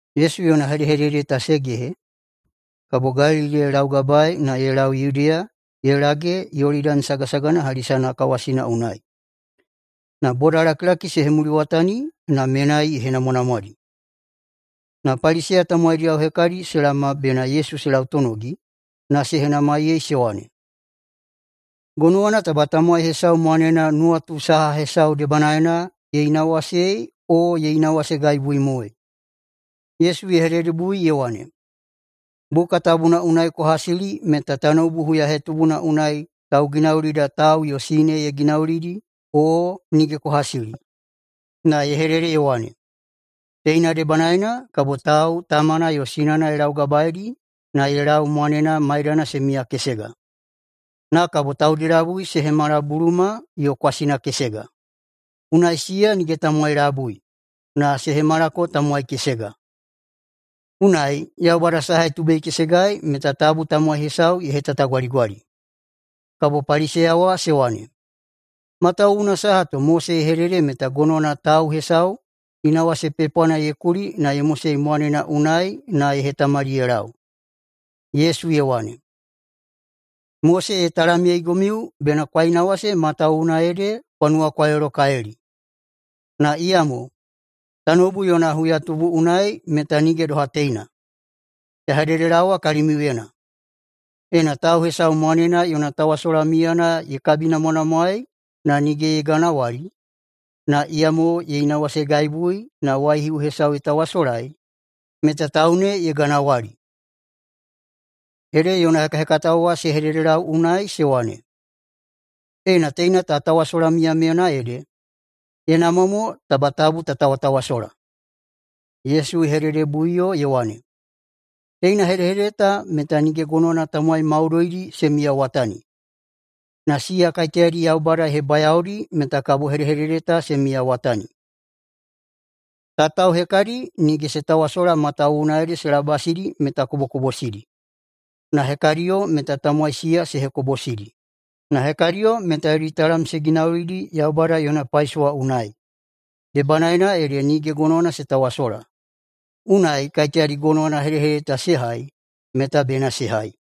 Yesu yona hedehedede ta se gehe, kabo Galili ye laugabaei na ye lau Yudeya ye lage Yolidani sagasagana hali sanakawasina unai. Na bodalakilaki se hemuliwatani, na menai ye henamwanamwadi. Na Paliseya tamowaidiyao hekadi se laoma bena Yesu se lautonogi, na se henamaiyei se wane, “Gonowana taba tamowai hesau mwanena nuwatu saha hesau debanaena ye inawasei, o ye inawasegaibuimoei?” Yesu ye hededebui ye wane, “Buka Tabuna unai kwa hasili meta tanoubu huyahetubuna unai Tauginaulida ‘tau yo sine ye ginaulidi’, o nige kwa hasili? Na ye hedede ye wane, ‘Teina debanaena kabo tau tamana yo sinana ye laugabaeidi na ye lau mwanena maidana se miyakesega. Na kabo taudi labui se hemala buluma yo kwasina kesega.’ Unai siya nige tamowai labui, na se hemalako tamowai kesega. Unai, Yaubada saha ye tubeikesegai meta tabu tamowai hesau ye hetatagwaligwali.” Kabo Paliseya wa se wane, “Matawuwuna saha to Mose ye hedede meta gonowana tau hesau inawase pepwana ye kuli na ye mosei mwanena unai na ye hetamali ye lau?” Yesu ye wane, “Mose ye talamyeigomiu bena kwa inawase matawuwuna ede kwa nuwakwailolokalili. Na iyamo tanoubu yona huyatubu unai meta nige doha teina. Ya hededelaowa kalimiuyena: Ena tau hesau mwanena yona tawasola miyana ye kabinamwanamwaei na nige ye ganawali, na iyamo ye inawasegaibui na waihiu hesau ye tawasolai, meta tau ne ye ganawali.” Ede yona hekahekatao wa se hededelau unai se wane, “Ena teina ta tawasola miyamiyana ede, ye namwa mo taba tabu ta tawatawasola.” Yesu ye hededebuiꞌuyo ye wane, “Teina hedehedede ta meta nige gonowana tamowai maudoidi se miyawatani, na siya kaiteyadi Yaubada ye hebayaodi meta kabo hedehedede ta se miyawatani. Tatao hekadi nige se tawasola matawuwuna se labasidi meta kobokobosidi, na hekadiyo meta tamowai siya se hekobosidi, na hekadiyo meta yodi talam se ginaulidi Yaubada yona paisowa unai, debanaena ede nige gonowana se tawasola. Unai kaiteyadi gonowana hedehedede ta se hai meta bena se hai.”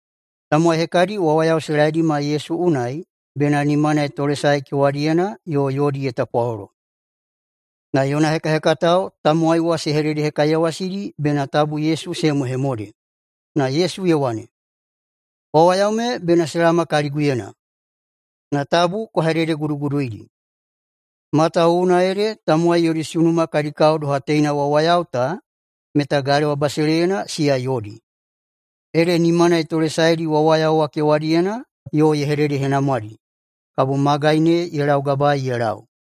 Tamowai hekadi wawayao se laedima Yesu unai bena nimana ye tolesae kewadiyena yo yodi ye tapwalolo. Na yona hekahekatao tamowai wa se hededehekaiyawasidi bena tabu Yesu se hemohemode. Na Yesu ye wane, “Wawayao me bena se laoma kaliguyena, na tabu kwa hededeguduguduidi. Matawuwuna ede tamowai yodi sunuma kadi kao doha teina wawayao ta meta galewa basileiyana siya yodi.” Ede nimana ye tolesaedi wawayao wa kewadiyena yo ye hededehenamwadi. Kabo magai ne ye laugabaei ye lau.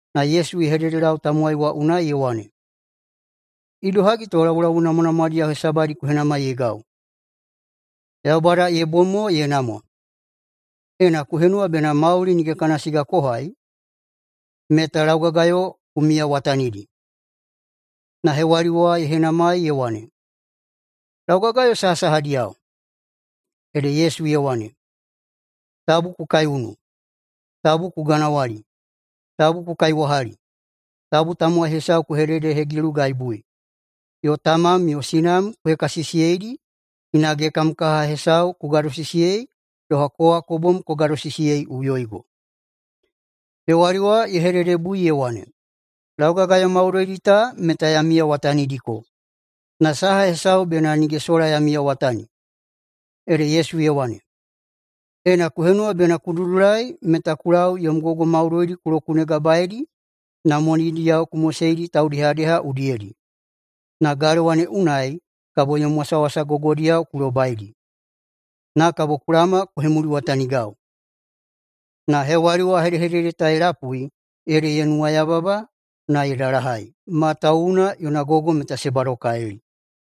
Na Yesu ye hededelau tamowai wa unai ye wane, “Idohagi to laulau namwanamwadiyao hesabadi ku henamaiyeigau? Yaubada ye bom mo ye namwa. Ena ku henuwa bena mauli nige kana siga ku hai, meta laugagayo ku miyawatanidi.” Na hewali wa ye henamai ye wane, “Laugagayo sahasahadiyao?” Ede Yesu ye wane, “Tabu ku kaiunu, tabu ku ganawali, tabu ku kaiwahali, tabu tamowai hesau ku hegilugaibui yo tamam yo sinam ku hekasisiyeidi, hinage kam kaha hesau ku gadosisiyei doha kowa ku bom ku gadosisiyeiꞌuyoigo.” Hewali wa ye hededebui ye wane, “Laugagayo maudoidi ta meta ya miyawatanidiko, na saha hesau bena nige sola ya miyawatani?” Ede Yesu ye wane, “Ena ku henuwa bena ku dudulai meta ku lau yom gogo maudoidi ku lokunegabaeidi na monidiyao ku moseidi taudehadeha udiyedi, na galewa ne unai kabo yom wasawasa gogodiyao ku lobaidi. Na kabo ku laoma ku hemuliwatanigau.” Na hewali wa hedehedede ta ye lapui ede ye nuwayababa na ye dalahai, matawuwuna yona gogo meta se badokalili.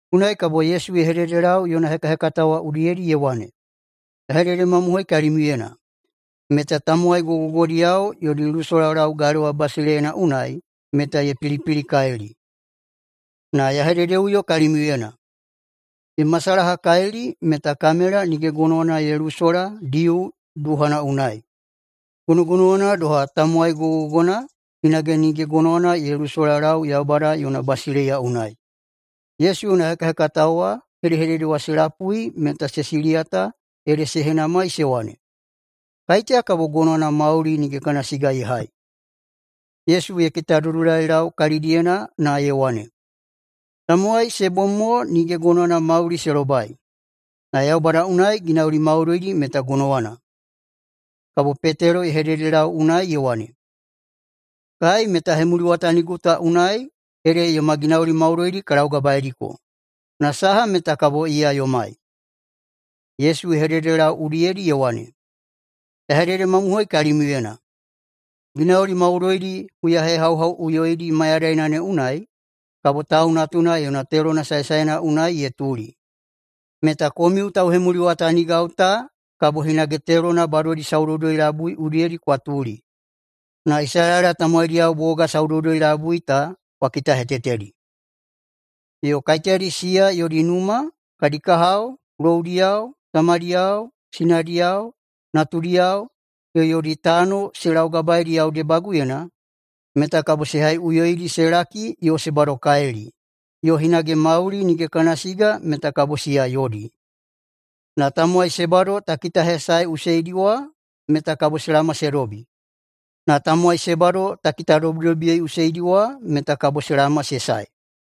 Unai kabo Yesu ye hededelau yona hekahekatao wa udiyedi ye wane, “Ya hededemamohoi kalimiuyena meta tamowai gogogogodiyao yodi lusolalau galewa basileiyana unai meta ye pilipilikalili. Na ya hededeꞌuyo kalimiuyena: [Ye masalahakalili meta] kamela nige gonowana ye lusola diu duhana unai. Gonogonowana doha, tamowai gogogogona hinage nige gonowana ye lusolalau Yaubada yona basileiya unai.” Yesu yona hekahekatao wa hedehedede wa se lapui meta se siliyata ede se henamai se wane, “Kaiteya kabo gonowana mauli nige kana siga ye hai?” Yesu ye kitadudulailau kalidiyena na ye wane, “Tamowai se bom mo nige gonowana mauli se lobai, na Yaubada unai ginauli maudoidi meta gonowana.” Kabo Petelo ye hededelau unai ye wane, “Kai meta hemuliwatanigo ta unai ede yoma ginauli maudoidi ka laugabaeidiko. Na saha meta kabo iya yomai?” Yesu ye hededelau udiyedi ye wane, “Ya hededemamohoi kalimiuyena: Ginauli maudoidi huyahehauhauꞌuyoidi mayadaina ne unai kabo Tau Natuna yona telona saesaena unai ye tuli, meta komiu tauhemuliwatanigau ta kabo hinage telona badodi saudoudoi-labui udiyedi kwa tuli na Isalaela tamowaidiyao boga saudoudoi-labui ta kwa kitahetetedi. Yo kaiteyadi siya yodi numa, kadi kahao, loudiyao, tamadiyao, sinadiyao, natudiyao yo yodi tano se laugabaeidi yau debaguyena, meta kabo se haiꞌuyoidi se laki yo se badokalili, yo hinage mauli nige kana siga meta kabo siya yodi. Na tamowai se bado ta kitahesaeꞌuseidi wa meta kabo se laoma se dobi, na tamowai se bado ta kitadobidobiyeiꞌuseidi wa meta kabo se laoma se sae.”